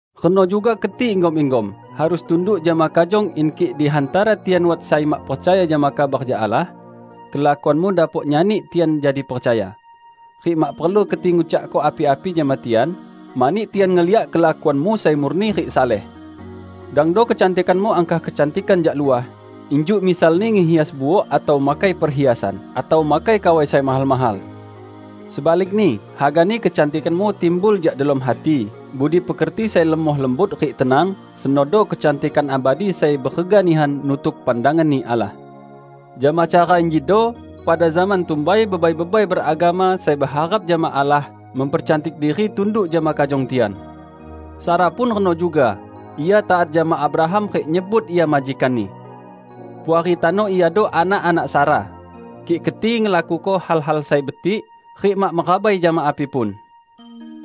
Reno juga keti, inggom-inggom, harus tunduk jama kajong in kik di hantara tian wat sai mak percaya jama kabar jak Allah, kelakuanmu dapok nyani tian jadi percaya. Rik mak perlu keti ngucakko api-api jama tian, mani tian ngeliak kelakuanmu sai murni rik saleh. Dangdo kecantikanmu angkah kecantikan jak luah, injuk misalni ngehias buok atau makai perhiasan, atau makai kawai sai mahal-mahal. Sebalikni, hagani kecantikanmu timbul jak delom hati, budi pekerti sai lemoh lembut rik tenang; senodo kecantikan abadi sai berega nihan nutuk pandangan-Ni Allah. Jama cara injido pada zaman tumbai bebai-bebai beragama sai beharap jama Allah mempercantik diri jama tunduk jama kajong tian. Sara pun reno juga, ia taat jama Abraham rik nyebut ia majikanni. Puari tano iado anak-anak Sara, kik keti ngelakuko hal-hal sai betik rik mak merabai jama api pun.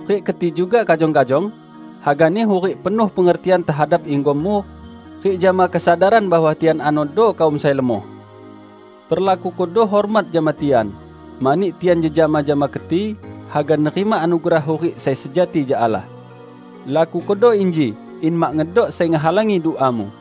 Rik keti juga, kajong-kajong, hagani hurik penuh pengertian tehadap inggommu rik jama kesadaran bahwa tian anodo kaum sai lemoh. Perlakukodo hormat jama tian, mani tian jejama jama keti, haga nerima anugerah hurik sai sejati jak Allah. Lakukodo inji, in mak ngedok sai ngehalangi duamu.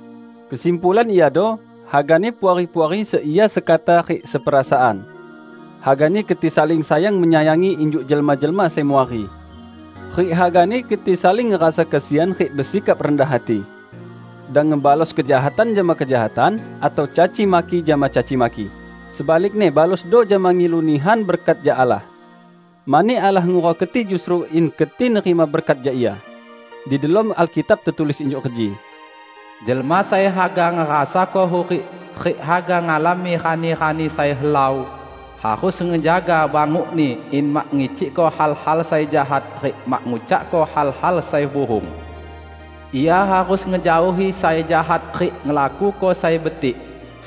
Kesimpulan iado: hagani Puari-puari seia sekata rik seperasaan. Hagani keti saling sayang-menyayangi injuk jelma-jelma sai muari. Rik hagani keti saling ngerasa kesian rik besikap rendah hati. Dang ngebalos kejahatan jama kejahatan, atau caci maki jama caci maki; sebalikni balosdo jama ngilu nihan berkat jak Allah. Mani Allah ngurau keti justru in keti nerima berkat jak Ia. Di delom Alkitab tetulis injuk reji, "Jelma sai haga ngerasako hurik rik haga ngalami rani-rani sai helau, harus ngejaga bangukni in mak ngicikko hal-hal sai jahat rik mak ngucakko hal-hal sai buhung. Ia harus ngejaohi sai jahat rik ngelakuko sai betik;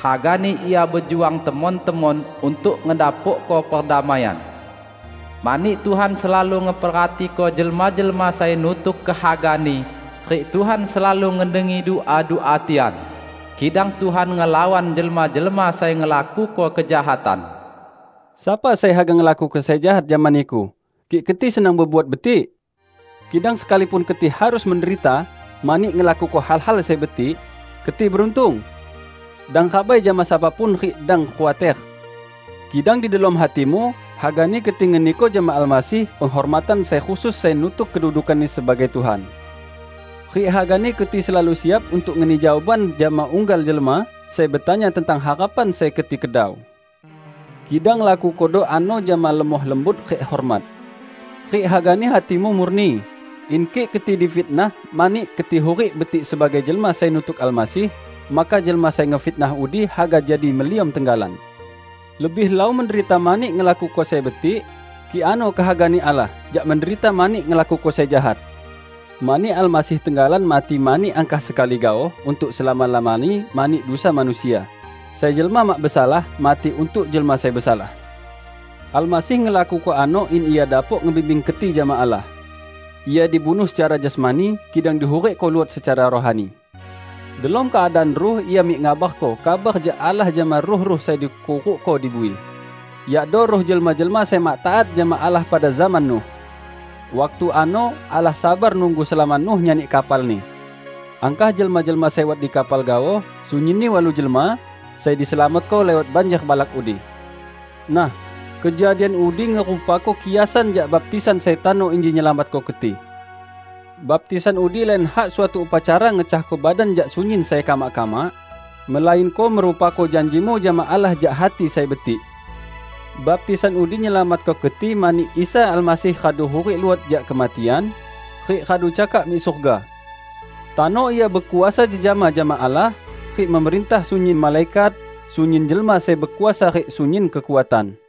hagani ia bejuang temon-temon untuk ngedapokko perdamaian. Mani Tuhan selalu ngeperhatiko jelma-jelma sai nutuk kehaga-Ni, rik Tuhan selalu ngedengi dua-dua tian; kidang Tuhan ngelawan jelma-jelma sai ngelakuko kejahatan." Sapa sai haga ngelakuko sai jahat jama niku, kik keti senang bebuat betik? Kidang sekalipun keti harus menderita mani ngelakuko hal-hal sai betik, keti beruntung! Dang rabai jama sapa pun rik dang khuater. Kidang di delom hatimu, hagani keti ngeniko jama Almasih penghormatan sai khusus sai nutuk kedudukan-Ni sebagai Tuhan. Rik hagani keti selalu siap untuk ngeni jawaban jama unggal jelma sai betanya tentang harapan sai keti kedau. Kidang lakukodo ano jama lemoh lembut rik hormat. Rik hagani hatimu murni, in kik keti difitnah mani keti hurik betik sebagai jelma sai nutuk Almasih, maka jelma sai ngefitnah udi haga jadi meliom tenggalan. Lebih helau menderita mani ngelakuko sai betik -- kik ano kehaga-Ni Allah -- jak menderita mani ngelakuko sai jahat. Mani Almasih tenggalan mati angkah sekali gaoh, untuk selama-lamani mani dusa manusia -- sai jelma mak besalah, mati untuk jelma sai besalah. Almasih ngelakuko ano in Ia dapok ngebimbing keti jama Allah. Ia dibunuh secara jasmani, kidang dihurikko luot secara rohani. Delom keadaan ruh Ia mik ngabarko kabar jak Allah jama ruh-ruh sai dikurukko di bui: yakdo ruh jelma-jelma sai mak taat jama Allah pada zaman Nuh. Waktu ano Allah sabar nunggu selama Nuh nyani kapalni. Angkah jelma-jelma sai wat di kapal gaoh -- sunyinni walu jelma -- sai diselamatko liwat banjer balak udi. Nah, kejadian udi ngerupako kiasan jak baptisan sai tano inji nyelamatko keti. Baptisan udi lain hak suatu upacara ngecahko badan jak sunyin sai kamak-kamak, melainko ngerupako janjimu jama Allah jak hati sai betik. Baptisan udi nyelamatko keti mani Isa Almasih radu hurik luot jak kematian, rik radu cakak mik surga. Tano Ia bekuasa jejama jama Allah rik memerintah sunyin malaikat, sunyin jelma sai bekuasa rik sunyin kekuatan.